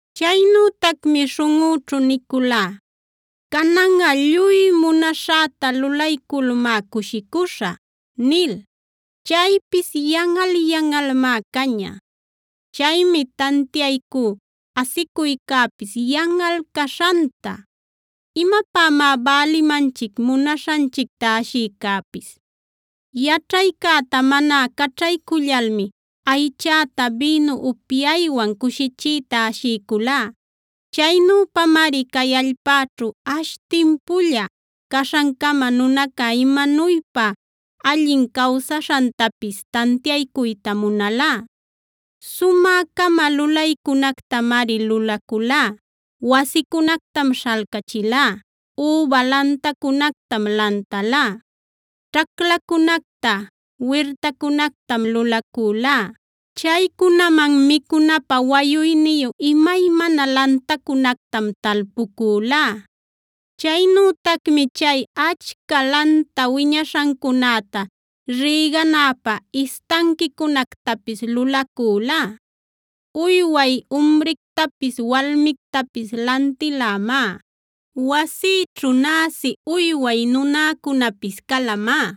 Chaynütacmi śhunꞌüćhu niculá: “Cananꞌa lluy munaśhäta lulayculmá cushicuśhä” nil. Chaypis yanꞌal-yanꞌalmá caña. Chaymi tantiaycú asicuycäpis yanꞌal caśhanta. ¿Imapämá bälimanchic munaśhanchicta ashiycäpis? Yaćhaycäta mana caćhaycullalmi aychäta bïnu upyaywan cushichiyta ashiyculá. Chaynüpamari cay allpäćhu ash timpulla caśhancama nunaca imanuypa allin cawsaśhantapis tantiaycuyta munalá. Sumä-cama lulaycunactamari lulacülá: Wasicunactam śhalcachilá,a üba lantacunactam lantalá, ćhaclacunacta wirtacunactam lulacülá, chaycunaman micunapä wayuyniyu imaymana lantacunactam talpucülá. Chaynütacmi chay achca lanta wiñashancunäta rïganäpä istanquicunactapis lulacülá. Uyway umrictapis walmictapis lantilämá; wasïćhu näsi uyway nunäcunapis calamá.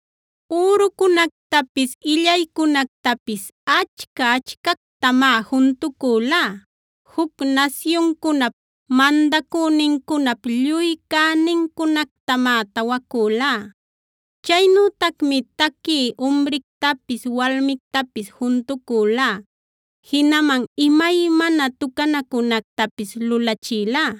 Ürucunactapis, illaycunactapis achca-achcactamá juntucülá; juc nasyuncunap mandacünincunap lluy cänincunactamá tawacülá.c Chaynütacmi taquï umrictapis walmictapis juntucülá, jinaman imaymana tucanacunactapis lulachilá.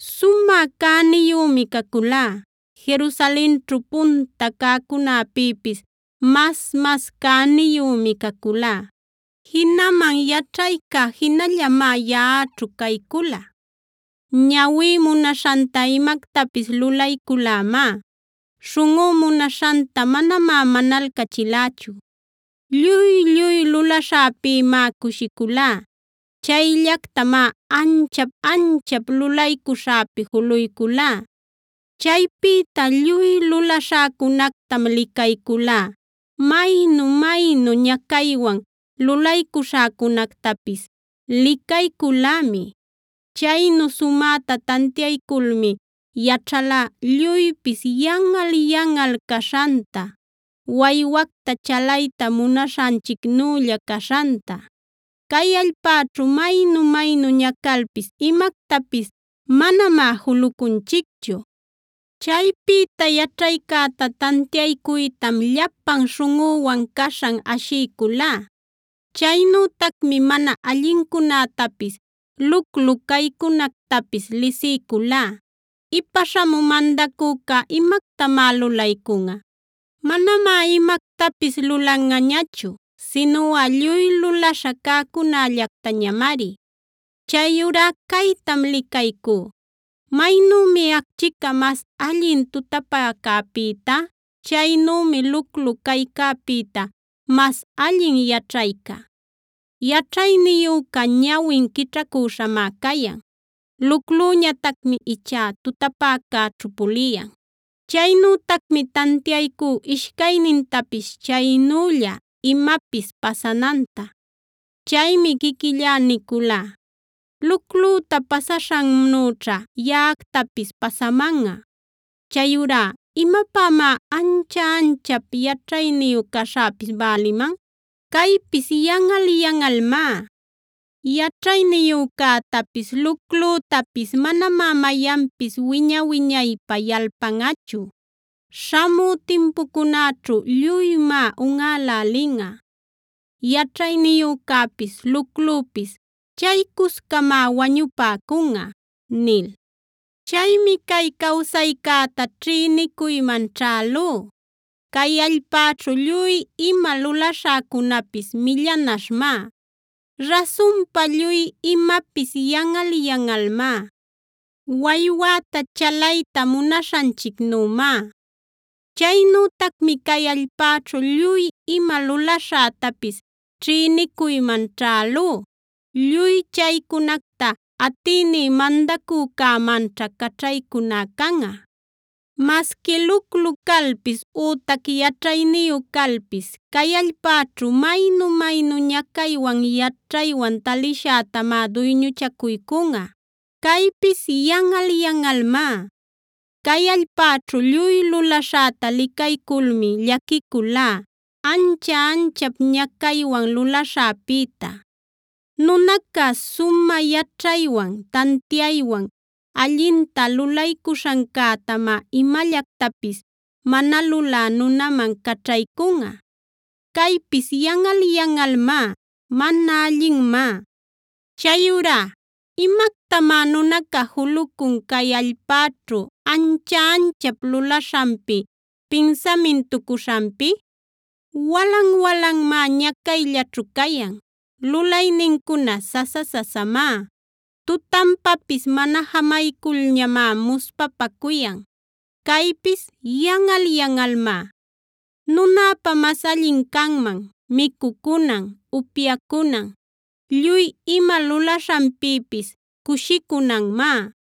Sumä cäniyümi caculá;e Jerusalenćhu punta cäcunäpïpis mas-mas cäniyümi caculá. Jinaman yaćhayca jinallamá yaꞌaćhu caycula. Ñawí munaśhanta imactapis lulayculämá; śhunꞌú munaśhanta manamá manalcachilächu. Lluy-lluy lulaśhäpïmá cushiculá; chayllactamá ancha-anchap lulaycuśhäpi juluyculá. Chaypïta lluy lulaśhäcunactam licayculá; maynu-maynu ñacaywan lulaycuśhäcunactapis licayculämi. Chaynu sumäta tantiayculmi yaćhalá lluypis yanꞌal-yanꞌal caśhanta, waywacta chalayta munaśhanchicnülla caśhanta. Cay allpäćhu maynu-maynu ñacalpis imactapis manamá julucunchicchu. Chaypïta yaćhaycäta tantiaycuytam llapan śhunꞌüwan caśhan ashiyculá; chaynütacmi mana allincunätapis, luclu caycunactapis lisiyculá. ¿Ipa śhamü mandacüca imactamá lulaycunꞌa? Manamá imactapis lulanꞌañachu sinuꞌa lluy lulaśha cäcunällactañamari. Chayurá caytam licaycú: maynümi acchica mas allin tutapäcäpïta, chaynümi luclu caycäpïta mas allin yaćhayca. Yaćhayniyüca ñawin quićhacüśhamá cayan; luclüñatacmi ichá tutapäcäćhu puliyan. Chaynütacmi tantiaycú ishcaynintapis chaynülla imapis pasananta. Chaymi quiquillá niculá: “Luclüta pasaśhannüćha yaꞌactapis pasamanꞌa. Chayurá ¿imapämá ancha-anchap yaćhayniyu caśhäpis bäliman? Caypis yanꞌal-yanꞌalmá. Yaćhayniyücätapis luclütapis manamá mayanpis wiña-wiñaypä yalpanꞌachu; śhamü timpucunäćhu lluymá unꞌälälinꞌa; yaćhayniyücäpis luclupis chaycuscamá wañupäcunꞌa” nil. Chaymi cay cawsaycäta ćhïnicuyman ćhälú; cay allpäćhu lluy ima lulaśhäcunapis millanaśhmá. Rasunpa lluy imapis yanꞌal-yanꞌalmá; waywäta chalayta munaśhanchicnümá. Chaynütacmi cay allpäćhu lluy ima lulaśhätapis ćhïnicuyman ćhälú; lluy chaycunacta atïní mandacücämanćha caćhaycuná canꞌa. Masqui luclu calpis ütac yaćhayniyu calpis cay allpäćhu maynu-maynu ñacaywan yaćhaywan talishätamá duyñuchacuycunꞌa. Caypis yanꞌal-yanꞌalmá. Cay allpäćhu lluy lulaśhäta licayculmi llaquiculá, ancha-anchap ñacaywan lulaśhäpïta. Nunaca sumä yaćhaywan, tantiaywan, allinta lulaycuśhancätamá imallactapis mana lulä nunaman caćhaycunꞌa. Caypis yanꞌal-yanꞌalmá; mana allinmá. Chayurá ¿imactamá nunaca julucun cay allpäćhu ancha-anchap lulaśhanpi, pinsamintucuśhanpi? Walan-walanmá ñacayllaćhu cayan.f Lulaynincuna sasa-sasamá; tutanpapis mana jamayculñamá muspapacuyan. Caypis yanꞌal-yanꞌalmá. Nunäpa mas allin canman micucunan, upyacunan, lluy ima lulaśhanpïpis cushicunanmá.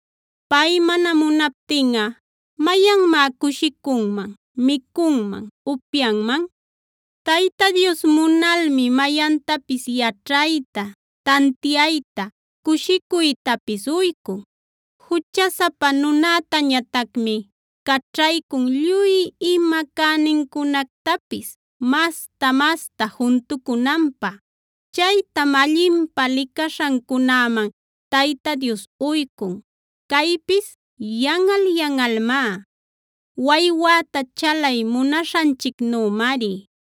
Pay mana munaptinꞌa ¿mayanmá cushicunman, micunman, upyanman? Tayta Dios munalmi mayantapis yaćhayta, tantiayta,h cushicuytapis uycun. Juchasapa nunätañatacmi caćhaycun lluy ima cänincunactapis masta-masta juntucunanpä; chaytam allinpä licaśhancunäman Tayta Dios uycun.i Caypis yanꞌal-yanꞌalmá; waywäta chalay munaśhanchicnümari.